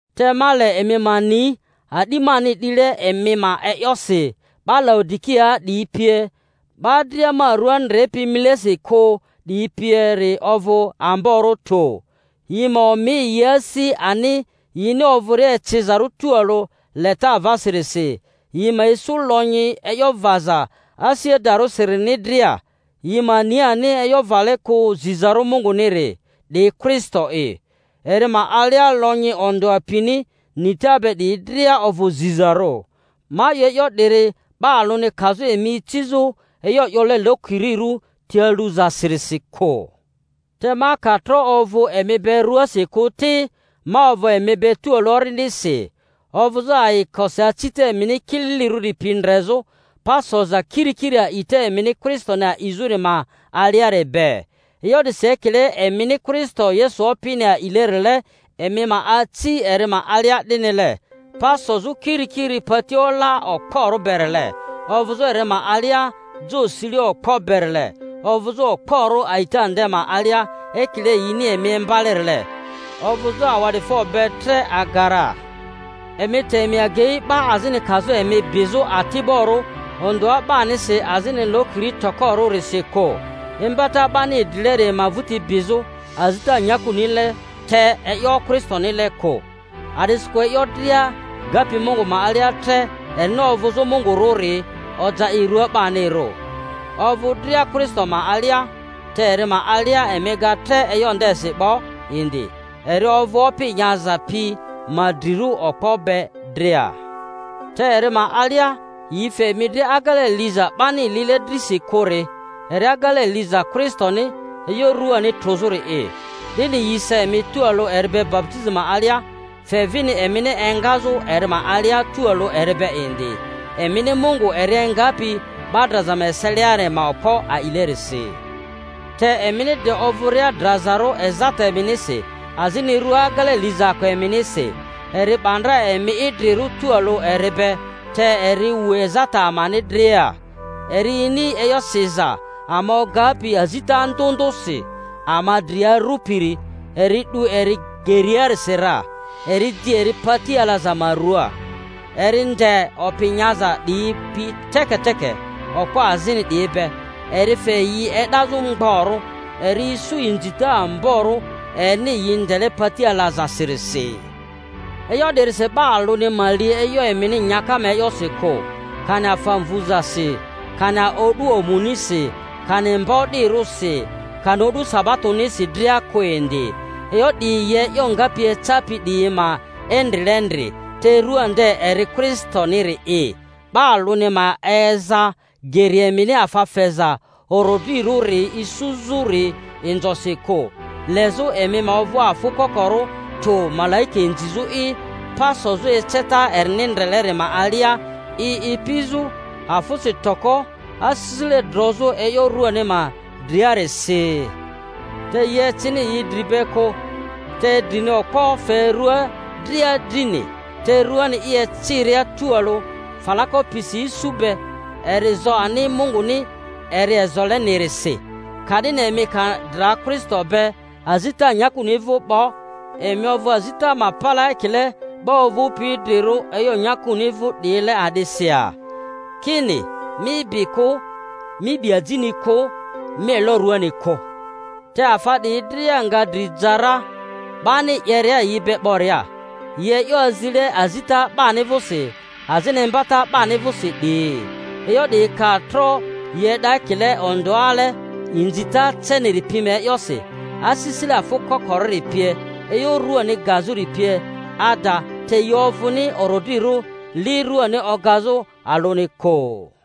Te ma le emi ma ni a'di mani 'dile emi ma e'yosi, 'ba Laodikiaa 'diyi pie, 'ba dria ma rᴜa ndrepi imilesi kᴜ 'diyi pieri ovᴜ amborᴜ tᴜ. Yi ma omi yi asi ani yini ovᴜria ecizarᴜ tualᴜ leta avasirisi, yi ma isu lonyi e'yo vaza asi adarᴜsirini dria, yi ma ni ani e'yo vale kᴜ zizarᴜ Munguniri, 'di Kristo'i. Eri ma alia lonyi ondᴜa pini nita be 'diyi dria ovᴜ zizarᴜ. Ma 'yo e'yo 'diri, 'ba alᴜni kazᴜ emi icizᴜ e'yo 'yole lokirirᴜ ti aluzasirisi kᴜ. Te ma ka tro ovᴜ emi be ruasi kᴜ ti, ma ovᴜ emi be tualᴜ orindisi, ovᴜzᴜ ayikosi acita emini kililirᴜri pi ndrezᴜ, pa soza kirikiri a'ita emini Kristoni a'izᴜri ma aliari be. E'yo 'disi ekile emini Kristo Yesu Opini a'ilerile, emi ma aci eri ma alia 'dinile, pa sozᴜ kirikiri pati ola okporᴜ berile, ovᴜzᴜ eri ma alia jo sile okpo berile, ovᴜzᴜ okporᴜ a'ita nde ma alia, ekile yini emi imbalerile, ovᴜzᴜ awa'difo be tre aga ra. Emi te emi agei 'ba azini kazᴜ emi bizᴜ ati'borᴜ ondᴜa 'banisi azini lokiri tokorᴜrisi kᴜ, imbata 'bani idrileri ma vᴜti bizᴜ, azita nyakunile te e'yo Kristonile kᴜ. A'disikᴜ e'yo dria gapi Mungu ma alia tre erini ovᴜzᴜ Mungurᴜri oja i rua 'banirᴜ, ovᴜ dria Kristo ma alia; te eri ma alia emi ga tre e'yo ndesi 'bo indi, eri ovᴜ opi nyaza pi ma drirᴜ okpo be dria. Te eri ma alia yi fe emi dri agele liza 'bani lile drisi kᴜri, eri agele liza Kristoni e'yo ruani trᴜzᴜri'i; 'dini yi sa emi tualᴜ eri be baputizi ma alia, fe vini emini engazᴜ eri ma alia tualᴜ eri be indi, emini Mungu eri engapi 'ba draza ma eseliari ma okpo a'ilerisi. Te emini de ovᴜria drazarᴜ ezata eminisi azini rua agele lizaako eminisi, eri 'ba ndra emi idrirᴜ tualᴜ eri be, te eri wu ezata amani dria; eri ini e'yo siza ama ogapi azita ndᴜ ndᴜsi ama dri arᴜpiri, eri 'du eri geriasi ra, eri di eri pati alaza ma ruaa. Eri nde opi nyaza 'diyi pi teketeke, okpo azini 'diyi be, eri fe yi e'dazᴜ mgborᴜ, eri isu inzita amborᴜ erini yi ndele pati alazasirisi. E'yo 'dirisi 'ba alᴜni ma li e'yo emini nyaka ma e'yosi kᴜ, kani afa mvᴜzasi, kani o'du omunisi, kani mba o'dirᴜsi, kani o'du sabatonisi dria kᴜ indi. E'yo 'diyi yi e'yo ngapi ecapi 'diyi ma endrilendri; te rua nde eri Kristoniri'i. 'Ba alᴜni ma eza geri emini afa feza orodrirᴜri isuzᴜri inzosi kᴜ, lezᴜ emi ma ovᴜ afᴜ kokorᴜ tᴜ malaika inzizᴜ'i, pa sozᴜ eceta erini ndreleri ma alia, i ipizᴜ afᴜsi toko asisile drozᴜ e'yo ruani ma driarisi, te yi ecini yi Dri be kᴜ, de drini okpo fe rua dria drini, te ruani i eciria tualᴜ falako pisi isu be, eri zo ani Munguni eri ezolenirisi. Ka'dini emi ka dra Kristo be azita nyakuni vᴜ 'bo, emi ovᴜ azita ma palaa ekile 'ba ovᴜpi idrirᴜ e'yo nyakuni vᴜ 'diyile a'disi ya? Ki-ni, Mi bi kᴜ, Mi 'bi ajini kᴜ, Mi elo ruani kᴜ (te afa 'diyi dria nga dri ja ra 'bani 'yeria yi be 'boria), yi e'yo azile azita 'bani vᴜsi azini imba-ta 'bani vᴜsi 'diyi. E'yo 'diyi ka tro yi e'da ekile ondᴜale inzita ceniri pi ma e'yosi, asisile afᴜ kokorᴜri pie, e'yo ruani gazᴜri pie ada, te yi ovᴜni orodrirᴜ li ruani ogazᴜ alᴜni kᴜ.